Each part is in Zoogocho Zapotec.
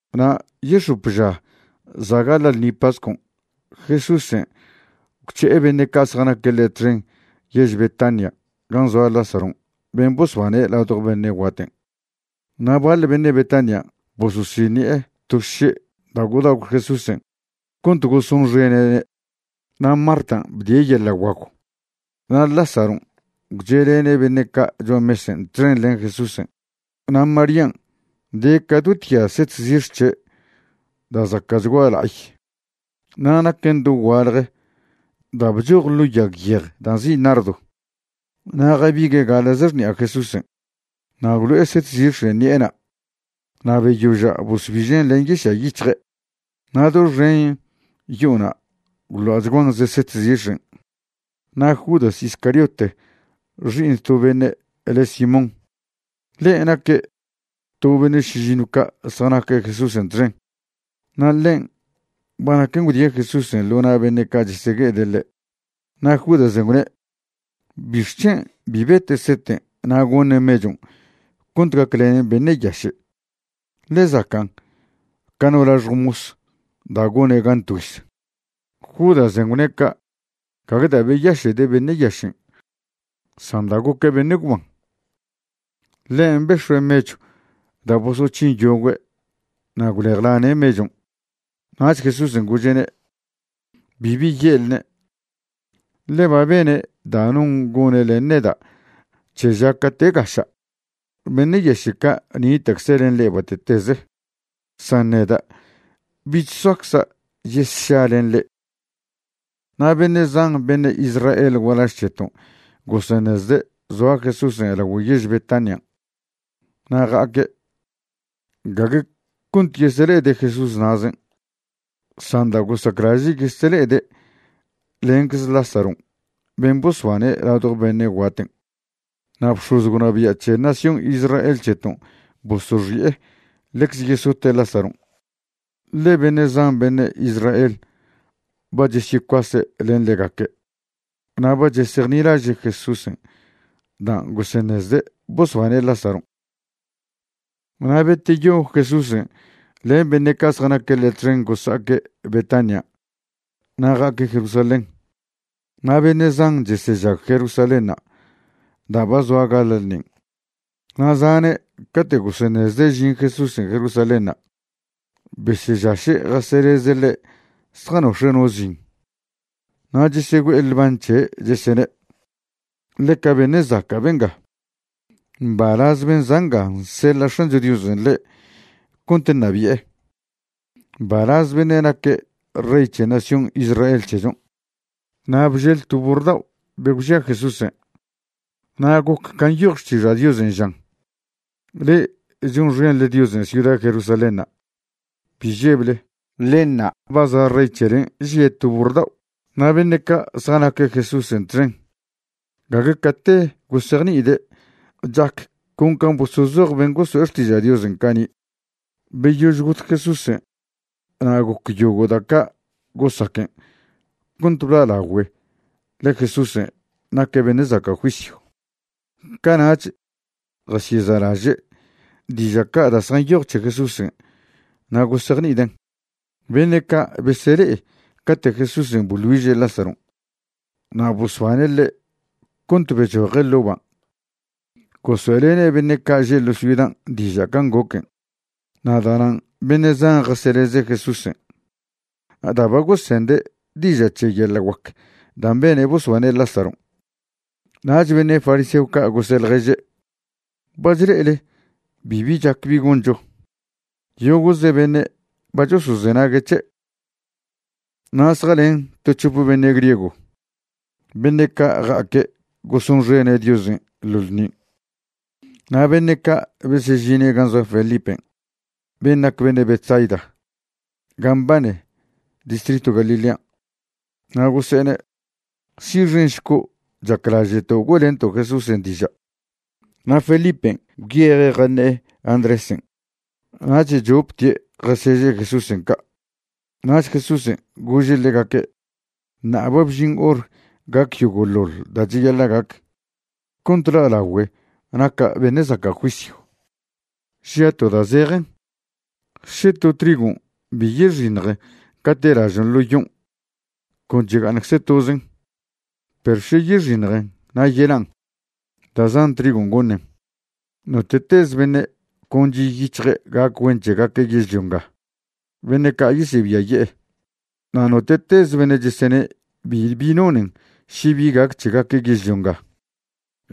Na' yex̱op ža za' gaḻa' ḻṉi pascon', Jesúsen' gwc̱he'e beṉe' ca' zjanaque' ḻe' txen yež Betanian' gan' zoa Lázaron' ben' bosbane' ladjo beṉe' guaten'. Na' baḻ beṉe' Betanian' bososiṉi'e to xše' da' gwdagw Jesúsen' cont gosonxene'ne'. Na' Martan' bdie' yeḻa' guagw na' Lázaron' gwche'lene' beṉe' ca' cho'a mesen' txen len Jesúsen'. Na' Marían', de ca do tya set zix̱ c̱he' da' zaca'chgua la'ay na' naquen dogualje da' bchoj ḻo yag yej da' nzi' nardo. Na' jabigue' gaḻa'ze xṉi'a Jesúsen' na' gwlo'e set zix̱en' ṉi'ena' na' beyoža' bosbižen' len yiša' yic̱hje'. Na' doxen yo'ona' gwḻa'chguan ze set zix̱en'. Na' Judas Iscariote xi'iṉ to beṉe' le' Simón, ḻe' naque' to beṉe' šižinw ca' zjanaque' Jesúsen' txen, na' ḻen' ba naquen gwdie' Jesúsen' ḻo na' beṉe' ca' chesegue'ede' ḻe'. Na' Judasen' gwne: ―¿Bixc̱hen' bi bete' seten' na' goṉe' mechon' cont gaclenen beṉe' yaše'? ḻe zacan' ca no laxjw mos da' gone' gan tgüiz. Judasen' gwne' ca' gague da' beyaše'de' beṉe' yašen' san da' goque' beṉe' gwban. Ḻen' bex̱ue' mechw da' bosoc̱hin yogüe' na' gwlejlane' mechon'. Nach Jesúsen' gože'ne': ―Bibi ye'lne', ḻe ba bene' da' non gone' len neda' c̱he ža cate' gaša'. Beṉe' yaše' ca' nita'cze' len le'e bate'teze, san neda' bich soacza' yesša len le'e. Na' beṉe' zan beṉe' Israel gualaž c̱heton' goseṉezde' zoa Jesúsen' lagüe' yež Betanian' na' ja'aque', gague cont yesele'ede' Jesús na'zen' san da' gosaclaže' yesele'ede' lencze Lázaron' ben' bosbane' ladjo beṉe' guaten'. Na' bx̱oz gwnabia' c̱he nación Israel c̱heton' bosoxi'e ḻecze yesote' Lázaron', ḻe beṉe' zan beṉe' Israel ba chesyecuase' len ḻegaque' na' ba chesejnilaže' Jesúsen' dan' goseṉezde' bosbane' Lázaron'. Na' beteyo Jesúsen' len beṉe' ca' zjanaque' ḻe' txen gosa'aque' Betanian' na' ja'aque' Jerusalén. Na' beṉe' zan chesežag Jerusalénṉa' da' ba zoa gaḻa' ḻṉin', na' zane' cate' goseṉezde' žin Jesúsen' Jerusalénṉa', besežaše' jaseḻeze' ḻe' zjanox̱e' no zin. Na' chesegüe'e ḻban' c̱he', chesene': ―¡Ḻeca beṉe' zaca' benga! Mbalaz ben' za' nga nseḻa' X̱ancho Diosen' ḻe' cont ṉabi'e. ¡Mbalaz beṉe' naque' Rey c̱he nación Israel c̱hechon'! Na' bžel to burr dao' be gwžia Jesúsen', na' goc can' nyoj Xtiža' Diosen' žan: Le'e chonxenḻe Diosen' ciuda Jerusalénṉa', bi žeble; ḻe ṉa', ba za' Rey c̱helen' žie' to burr dao'. Na' beṉe' ca' zjanaque' Jesúsen' txen gague cate gosejni'ide' chac con can' bosozoj ben' goso'e xtiža' Diosen' cani'. Beyož got Jesúsen' na' goc yogo' da' ca' gosaquen' cont bla'lagüe ḻe Jesúsen' naque' beṉe' zaca' juisyw, cana'ch jasyeza'laže' diža' ca' da' zjanyoj c̱he Jesúsen' na' gosejni'iden'. Beṉe' ca' besele'e cate' Jesúsen' boḻ güiže' Lázaron' na' bosbane' ḻe' cont bechoje' ḻo' ban' gosoe'lene' beṉe' ca' že' ḻo ciudan' diža' can' goquen'. Na' da'nan' beṉe' zan jaseleze' Jesúsen' da' ba gosende' diža' c̱he yeḻa' guac dan' bene' bosbane' Lázaron'. Nach beṉe' fariseo ca' gose' ḻježe': ―Ba chle'ele bibi chac bi goncho. Yogo'ze beṉe' ba chosozenague' c̱he'. Na' zjalen to c̱hope beṉe' griego beṉe' ca' ja'aque' gosonxene' Diosen' ḻo ḻṉin'. Na' beṉe' ca' besežine' gan' zoa Felipen' ben' nac beṉe' Betsaida ga mbane distritw Galilean', na' gose'ene': ―Si'xenšco', chaclaže'to' güe'lento' Jesúsen' diža'. Na' Felipen' gwyeje' jaṉe'e Andrésen' nach choptie' jaseže' Jesúsen' ca'. Nach Jesúsen' gože' ḻegaque': ―Ṉa'a ba bžin hor gac yogo'ḻoḻ da' cheyaḻa' gac cont la'lagüe naca' beṉe' zaca' juisyw. Žia' to da' zejen, še to trigon' bi yexiṉjen cate' lažon' ḻo yon', con chega'aṉcze tozen; perw še yexiṉjen na' yelan', da' zan trigon' goṉen. Note'tez beṉe' con chi' yic̱hje' gac güen c̱hegaque' yežlio nga, beṉe' ca' yesebiaye'e. Na' note'teze beṉe' chesene' bibi nonen še bi gac c̱hegaque' yežlio nga,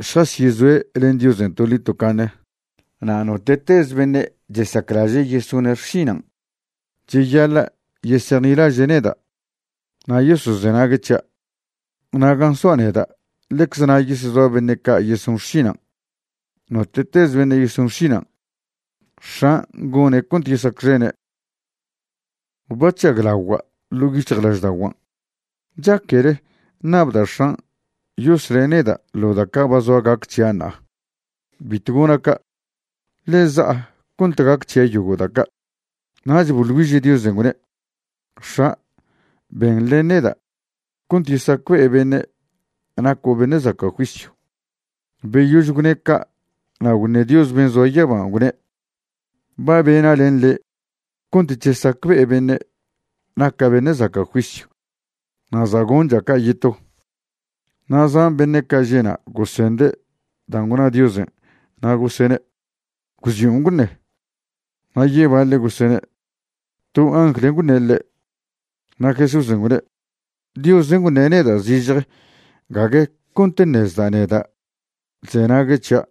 šjasyezoe' len Diosen' toḻi tocaṉe. Na' note'tez beṉe' chesaclaže' yesone' xšinan', cheyaḻa' yesejnilaže' neda' na' yosozenague' c̱hia'. Na' gan' soa' neda' ḻecze na' yesezoa beṉe' ca' yeson xšinan'. Note'tez beṉe' yeson xšinan', X̱an' gone' cont yesacxene'. ’Ba chžaglagua' ḻo' yic̱hjlažda'oguan'. ¿Chaquele ṉabda' X̱an' yosle' neda' ḻo da' ca' ba zoa gac c̱hia' ṉa'a? Bitw gona' ca', ḻe za'a cont gac c̱hia' yogo' da' ca'. Nach boḻ güiže' Diosen', gwne': ―X̱a', ben len neda' cont yesacbe'e beṉe' naco' beṉe' zaca' juisyw. Beyož gwne' ca' na' gwṉe Dios ben' zoa yaban', gwne': ―Ba bena' len le' cont chesacbe'e beṉe' naca' beṉe' zaca' juisyw na' za' goncha' ca' yeto. Na' zan beṉe' ca' že' na' gosende' dan' gwna Diosen' na' gosene' gwzion' gwṉe. Na' yebaḻe' gosene': ―To angl gwṉe' ḻe'. Na' Jesúsen' gwne': ―Diosen' gwṉe' neda' zižje gague cont ṉezda' neda' chzenague' c̱hia'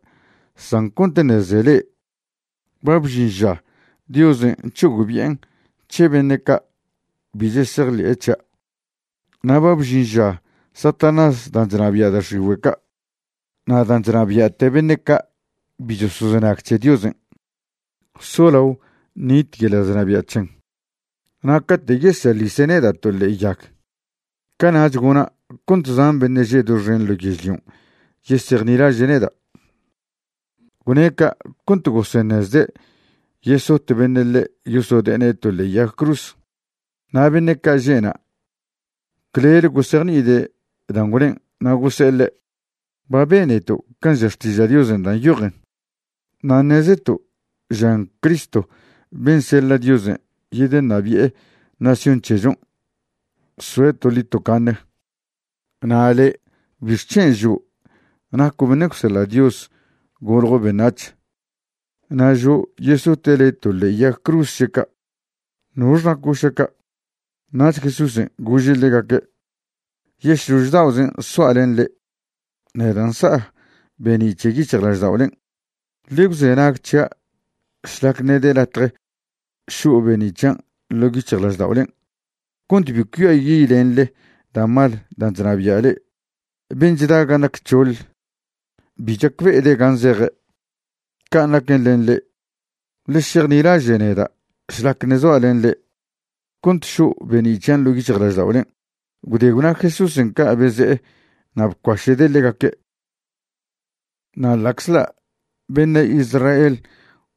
san cont ṉeze le'e. Ba bžin ža Diosen' c̱hogbi'en' c̱he beṉe' ca' bi chesejḻe'e c̱hia'. Na' ba bžin ža Satanás dan' chnabia' da' x̱igüe' ca' na' dan' chnabia'te beṉe' ca' bi chosozenag c̱he Diosen' solao ṉit yeḻa' chnabia' c̱hen. Na' cate' yeseḻise' neda' to ḻe'e yag, cana'ch gona' cont zan beṉe' že' doxen ḻo yežlion' yesejnilaže' neda'. Gwne' ca' cont goseṉezde' yesot beṉe' ḻe' yosode'ene' to ḻe'e yag cruz. Na' beṉe' ca' že'na' clele gosejni'ide' dan' gwnen' na' gose'e ḻe': ―Ba beneto' can' ža Xtiža' Diosen' da' nyojen, na' ṉezeto' žan Cristo ben' seḻa' Diosen' yedeṉabi'e nación c̱hechon' soe' toḻi tocaṉe. Na' le' ¿bixc̱hen' žo' naco' beṉe' gwseḻa' Dios goljo' beṉac̱h na' žo' yesote' le' to ḻe'e yag cruz še ca'? ¿Nox naco' šaca'? Nach Jesúsen' gože' ḻegaque': ―Yešlož da'ozen' soa' len le'e, neda' nsa' be'ni' c̱he yic̱hjlažda'olen'. Ḻe gwzenag c̱hia' šlac ṉe' de latje šo' be'ni' c̱hian' ḻo' yic̱hjlažda'olen', cont bi cuiayi'lenḻe da' mal dan' chnabia' le'e. Ben' chda gan' nac c̱hoḻ bi chacbe'ede' gan' zeje'. Can' naquen len le'e. Ḻe šejnilaže' neda' šlac ṉe' zoa' len le'e, cont šo' be'ni' c̱hian' ḻo' yic̱hjlažda'olen'. Gwde gwna Jesúsen' ca' beze'e na' bcuaše'de' ḻegaque'. Na' ḻa'czḻa' beṉe' Israel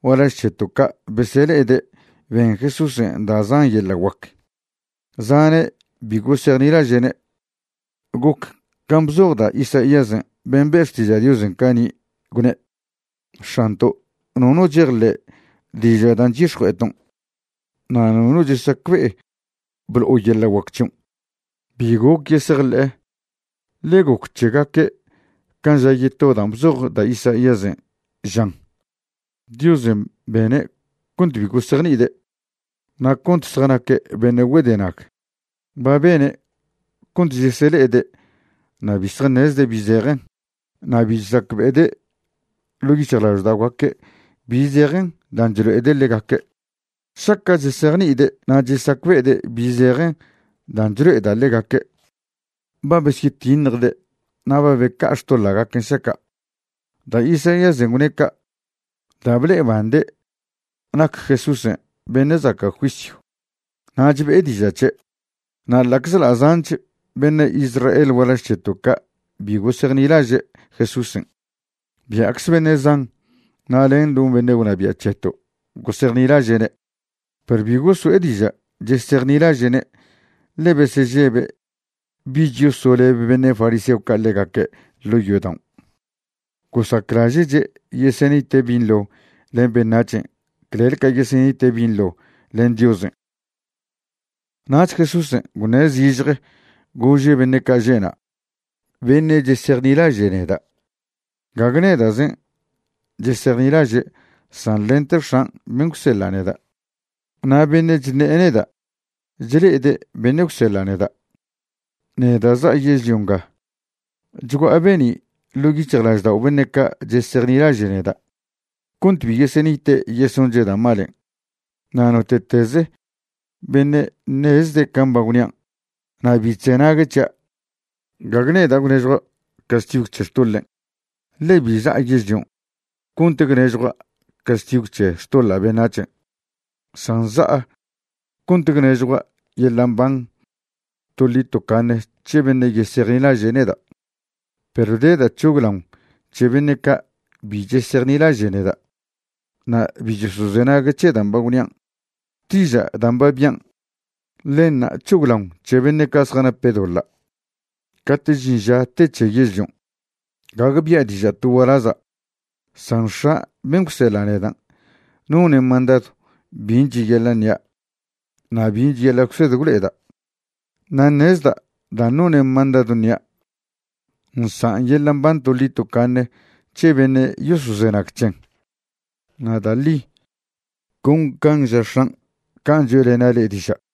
gualaž c̱heto' ca' besele'ede' ben Jesúsen' da' zan yeḻa' guac, zane' bi gosejnilaže'ne'. Goc can' bzoj da' Isaíasen' ben' be' xtiža' Diosen' cani', gwne': X̱anto', nono chejḻe' diža' dan' chyix̱jue'eton', na' nono chesacbe'e blo'o yeḻa' guac c̱hion'. Bi goc yesejḻe'e, ḻe goc c̱hegaque' can' ža yeto dan' bzoj da' Isaíasen', žan: Diosen' bene' cont bi gosejni'ide' na' cont zjanaque' beṉe' güedena. Ba bene' cont chesele'ede' na' bi zjaṉezde' bi zejen, na' bi chesacbe'ede' ḻo' yic̱hjlažda'ogaque' bi zejen dan' chlo'ede' ḻegaque'. Šaca' chesejni'ide' na' chesacbe'ede' bi zejen dan' chlo'eda' ḻegaque', ba besyetiṉjde' na' ba beca'a xtoḻa'gaquen' šaca'. Da' Isaíasen' gwne' ca' da' ble'ebande' nac Jesúsen' beṉe' zaca' juisyw nach be'e diža' c̱he'. Na' ḻa'czḻa' zanch beṉe' Israel gualaž c̱heto' ca' bi gosejnilaže' Jesúsen', bia'cze beṉe' zan na' len no beṉe' gwnabia' c̱heto' gosejnilaže'ne', perw bi goso'e diža' chesejnilaže'ne' ḻe besežebe' bich yosoleb beṉe' fariseo ca' ḻegaque' ḻo' yodaon'. Gosaclaže'che' yesenite' binḻo len beṉac̱hen' clel ca yesenite' binḻo len Diosen'. Nach Jesúsen' gwne' zižje gože' beṉe' ca' že'na': ―Beṉe' chesejnilaže' neda' gague neda'zen' chesejnilaže' san lente X̱an' ben' gwseḻa' neda'. Na' beṉe' chṉe'e neda' chle'ede' beṉe' gwseḻa' neda'. Neda' za'a yežlio nga chgua'a be'ni' ḻo' yic̱hjlaždao' beṉe' ca' chesejnilaže' neda', cont bi yesenite' yesonche' da' malen'. Na' note'tez beṉe' ṉezde' can' ba gwnian' na' bi chzenague' c̱hia', gague neda' gwnežjua' castigw c̱he xtoḻen', ḻe bi za'a yežlion' cont gwnežjua' castigw c̱he xtoḻa' beṉac̱hen', san za'a cont gwnežjua' yeḻa' mban toḻi tocaṉe c̱he beṉe' yesejnilaže' neda'. Perw de da' c̱hoglaon c̱he beṉe' ca' bi chesejnilaže' neda' na' bi chosozenague' c̱he dan' ba gwnian', xtižan' dan' ba bian', ḻenṉa' c̱hoglaon c̱he beṉe' ca' zjanape' doḻa' cate' žin ža te c̱he yežlion'. Gague bia' diža' to gualaza', san X̱a' ben' gwseḻa' nedan' none' mandadw bin' cheyaḻa' ṉia' na' bin' cheyaḻa' gwsed gwlo'eda'. Na' ṉezda' dan' none' mandadw ṉia' nsan' yeḻa' mban toḻi tocaṉe c̱he beṉe' yosozenag c̱hen. Na' da' ḻi, con can' ža X̱an', can' choe'lena' le'e diža'.